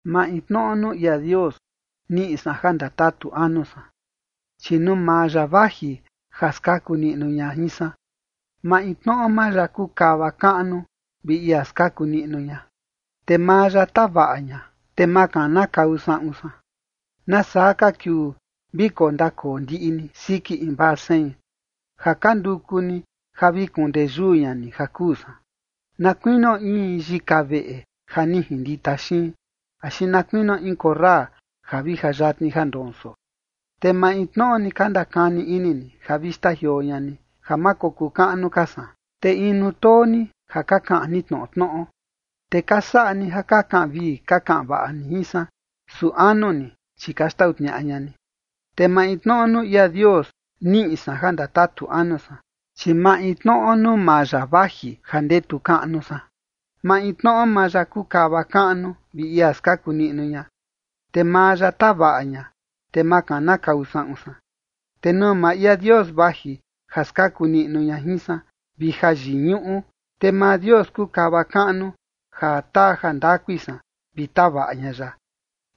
Maintnoꞌo nuu ia Dios niꞌi san ja ndatatu anu san, chi nuu maa ya vaji ja skaku niꞌnu ña jin san. Maintnoꞌo maa ya kuu kava kaꞌnu vi ia skaku niꞌnu ña. Te maa ya tavaꞌa ña, te ma kanakau saꞌun san. ¿Nasaa ka kiuu vi kondakoo ndiꞌi ni siki invaa sein ja ka nduku ni ja vi kuun ndeyuu ña ni ja kuu san, na kuinio in yika veꞌe ja ni jindita xiin, axi na kuinio in korra ja vi ja yatni ja ndonso? Te maintnoꞌo ni ka ndakani ini ni ja vi xtajioo ña ni, ja ma kokuu kaꞌnu ka san, te inu too ni ja ka kaꞌan ni tnoꞌo tnoꞌo. Te ka saꞌa ni ja ka kaꞌan vii ka kaꞌan vaꞌa ni jin san, su anu ni, chi ka xtau tniaꞌa ña ni. Te maintnoꞌo nuu ia Dios niꞌi san ja ndatatu anu san, chi maintnoꞌo nuu maa ya vaji ja ndetu kaꞌnu san. Maintnoꞌo maa ya kuu kava kaꞌnu vi ia skaku niꞌnu ña. Te maa ya tavaꞌa ña, te ma kanakau saꞌun san. Te nuu maa ia Dios vaji ja skaku niꞌnu ña jin san, vi ja yiñuꞌu, te maa Dios kuu kava kaꞌnu ja taa jandakui san vi tavaꞌa ña ya.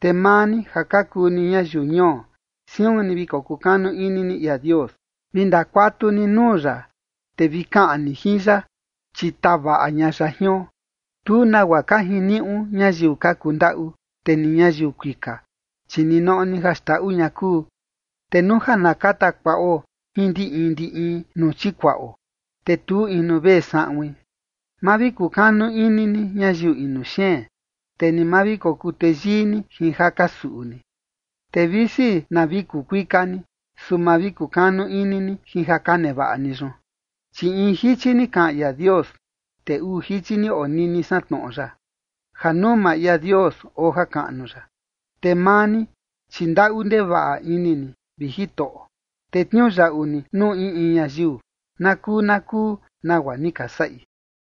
Te maa ni ja ka kuu ni ñayiu ñuo, siun ni vi kukanu ini ni ia Dios. Vi ndakuatu ni nuu ya, te vi kaꞌan ni jin ya, chi tavaꞌa ña ya jion. Tu nagua ka jiniuꞌu ñayiu ka kundaꞌu, te ni ñayiu kuika, chi ninoꞌo ni ja xndaꞌu ña kuu, te nuu ja na kata kuaꞌo jin ndi in ndi in nuu chikuaꞌo, te tu inu vee saꞌuin. Ma vi kukanu ini ni ñayiu inu xeen, te ni ma vi kokuu teyii ni jin ja ka suꞌu ni. Te visi na vi kuu kuika ni, su ma vi kukanu ini ni jin ja ka nevaꞌa ni yun. Chi in jichi ni kaꞌan ia Dios, te uu jichi ni onini san tnoꞌo yaꞌa: Ja nuu maa ia Dios oo jakaꞌnu ya. Te maa ni, chi ndaꞌu ndevaꞌa ini ni, vi Jitoꞌo, te tniuyaꞌu ni nuu in in ñayiu na kuu na kuu nagua ni ka saꞌi.